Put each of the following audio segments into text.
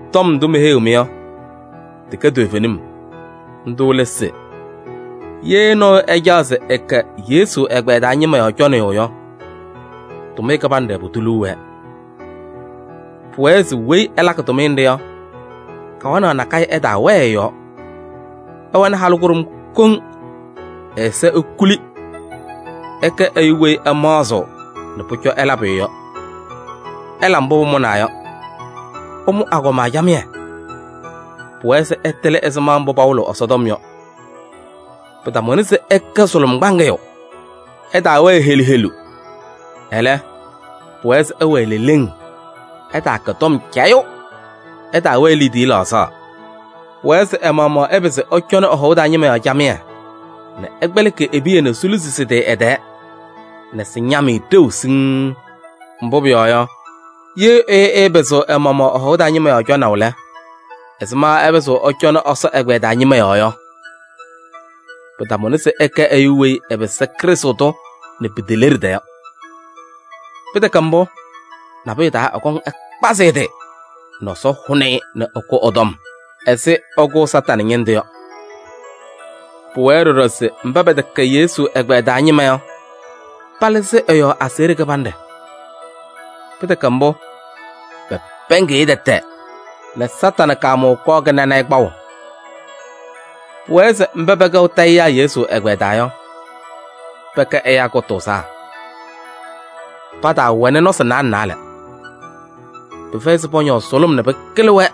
Tɔm ndʋ meheyiɣ-mɩ yɔ, tɩkɛ toovenim. Ndʋ lɛ se: ye nɔɔyʋ ɛcaɣ se ɛkɛ Yesu ɛgbɛyɛ taa ñɩma yɔɔ cɔnɩyʋ yɔ, tʋmɩyɛ kɩbanɖɛ pʋdʋ liu wɛɛ. Pʋwɛɛ se weyi ɛlakɩ tʋmɩyɛ nɖɩ yɔ, kawanaɣ nakɛyɛ ɛtaawɛɛ ɛ-yɔɔ. Ɛwɛnɩ halʋ kʋɖʋm koŋ, ɛ-ɛza ekuli. Ɛkɛ ɛyʋ weyi ɛmaɣzɩɣ nɛ pʋcɔ ɛla pʋyʋ yɔ, ɛla mbʋ pʋmʋnaa yɔ, ɛmʋ agɔma camɩyɛ. Pʋwɛɛ se ɛtɩlɩ ɛzɩma mbʋ pawɩlɩɣ Ɛsɔtɔm yɔ. Pɩtamʋnɩ se ɛkɛ sʋlʋm kpaŋɩyʋ, ɛtaawɛɛ helu helu. Ɛlɛ, pʋwɛɛ se ɛwɛɛ leleŋ, ɛtaakɛ tɔm cayʋ, ɛtaawɛɛ liidiye laɣzaɣ. Pʋwɛɛ se ɛ-maɣmaɣ ɛpɩzɩ ɛcɔnɩ ɛ-hɔʋ taa ñɩma yɔɔ camɩyɛ nɛ ɛkpɛlɩkɩ e-piya nɛ siluzi sɩ-tɩ ɛ-tɛɛ nɛ sɩñam-ɩ ɖeu siŋŋ. Mbʋ pʋyɔɔ yɔ, ye ɛyʋ ɛɛpɩzɩɣ ɛ-maɣmaɣ ɛ-hɔʋ taa ñɩma yɔɔ cɔnaʋ lɛ, ɛzɩma ɛpɩzɩɣ ɛcɔnɩ Ɛsɔ ɛgbɛyɛ taa ñɩma yɔɔ yɔ? Pɩtamʋnɩ se ɛkɛ ɛyʋ weyi ɛpɩsɩ Krɩstʋ tʋ nɛ piteleɖida yɔ. Pɩtɛkɛ mbʋ, nabʋyʋ taa ɛkɔŋ ɛkpazɩ ɛ-tɩ nɛ Ɛsɔ hʋnɩ-ɩ nɛ ɛkʋ ɛ-tɔm ɛzɩ ɛkʋʋ Satanɩ ñɩndʋ yɔ. Pʋwɛɛ ɖɔɖɔ se mba pɛtɛkɛ Yesu ɛgbɛyɛ taa ñɩma yɔ, palɩzɩ ɛ-yɔɔ aseɣɖe kɩbanɖɛ. Pɩtɛkɛ mbʋ, pɛpɛɛŋɩɣ-ɩ tɛtɛ nɛ Satanɩ kaamʋʋ kɔɔ kɩnanɩ-ɩ kpaʋ. Pʋwɛɛ se mba pɛkɛɣ tayɩyaa Yesu ɛgbɛyɛ taa yɔ, pɛkɛ ɛyaa kʋtʋʋzaa, pataawɛnɩ nɔsɩ naalɛ naalɛ. Pɩfɛyɩ se pɔñɔɔ sʋlʋm nɛ pɩkɩlɩ-wɛ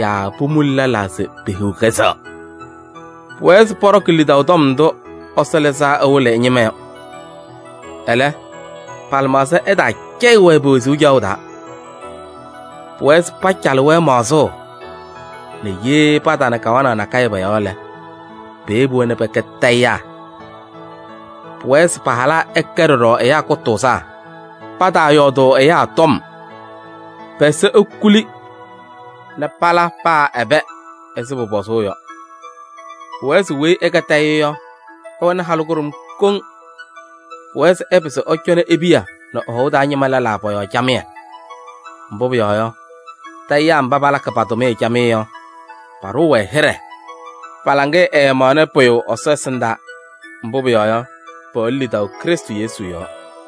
yaa pomuli lɛlaa se pehiɣ kɛzɛɣ. Pʋwɛɛ se pɔɖɔkɩ lidaʋ tɔm ndʋ Ɛsɔ lɩzaa ɛwɩlɩ ɛ-ñɩma yɔ. Ɛlɛ, pa-lɩmaɣza ɛtaacɛyɩ-wɛ pe-wezuu caɣʋ taa. Pʋwɛɛ se pacalɩ-wɛ maɣzʋʋ nɛ ye patana kawanaɣ nakɛyɛ pɔ-yɔɔ lɛ, peyebi-wɛ nɛ pɛkɛ tayɩyaa. Pʋwɛɛ se pa-halaa ɛkɛ ɖɔɖɔ ɛyaa kʋtʋʋzaa. Pataayɔɔdʋʋ ɛyaa tɔm, pɛ-ɛza ekuli nɛ pala paa ɛbɛ ɛzɩ pʋpɔzʋʋ yɔ. Pʋwɛɛ se weyi ɛkɛ tayɩyʋ yɔ, ɛwɛnɩ halʋ kʋɖʋm koŋ. Pʋwɛɛ se ɛpɩzɩ ɛcɔnɩ e-piya nɛ ɛ-hɔʋ taa ñɩma lɛlaa pɔ-yɔɔ camɩyɛ. Mbʋ pʋyɔɔ yɔ, tayɩyaa mba palakɩ pa-tʋmɩyɛ camɩyɛ yɔ, paɖʋʋ-wɛ hɩɖɛ, pa-laŋɩyɛ ɛɛmaɣnɩ pʋyʋ Ɛsɔ ɛsɩndaa. Mbʋ pʋyɔɔ yɔ, pɛwɛnɩ lidaʋ Krɩstʋ Yesu yɔɔ.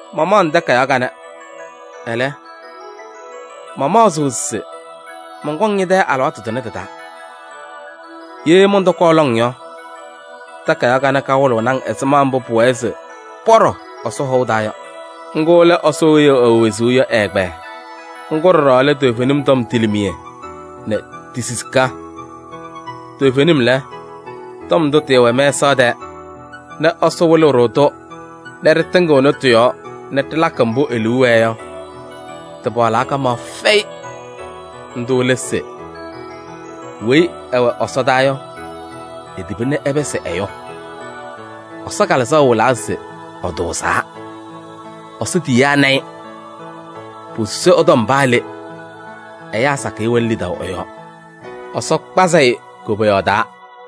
Mamaɣ-ŋ takayaɣ kanɛ, ɛlɛ, mamaɣzɩɣ se mɔnkɔŋ ñɛ-tɛ alɩwaatʋ tʋnɛ tɩ-taa. Ye mɔntɔkɔɔ lɔŋ yɔ, takayaɣ kanɛ kawɩlɩɣnɩ-ŋ ɛzɩma mbʋ pʋwɛɛ se pɔɖɔ Ɛsɔ hɔʋ taa yɔ. Ŋgʋ lɛ Ɛsɔ weyi ɛwɛ wezuu yɔ ɛ-ɛgbɛyɛ. Ŋgʋ ɖɔɖɔ lɛ toovenim tɔm tilimiye nɛ ti-sisika. Toovenim lɛ, tɔm ndʋ tɩɩwɛ mɛsaɣ tɛɛ nɛ Ɛsɔ wɩlɩ-ɖʋ-tʋ nɛ ɖɩtɩŋɩɣnɩ tɩ-yɔɔ nɛ ɖɩlakɩ mbʋ e-liu wɛɛ yɔ, tɩpaɣlaa kamaɣ fɛyɩ! Ndʋ lɛ se: weyi ɛwɛ ɛsɔdaa yɔ, etiba nɛ ɛpɩsɩ ɛyʋ. Ɛsɔ Kalɩzaɣ wɩlaa se ɛtʋʋzaa, Ɛsɔ tiyiyaa na-ɩ. Posusi ɛ-tɔm paa le, ɛyaa sakɩyɛ wɛnɩ lidaʋ ɛ-yɔɔ, Ɛsɔ kpazɩ-ɩ koboyaɣ taa.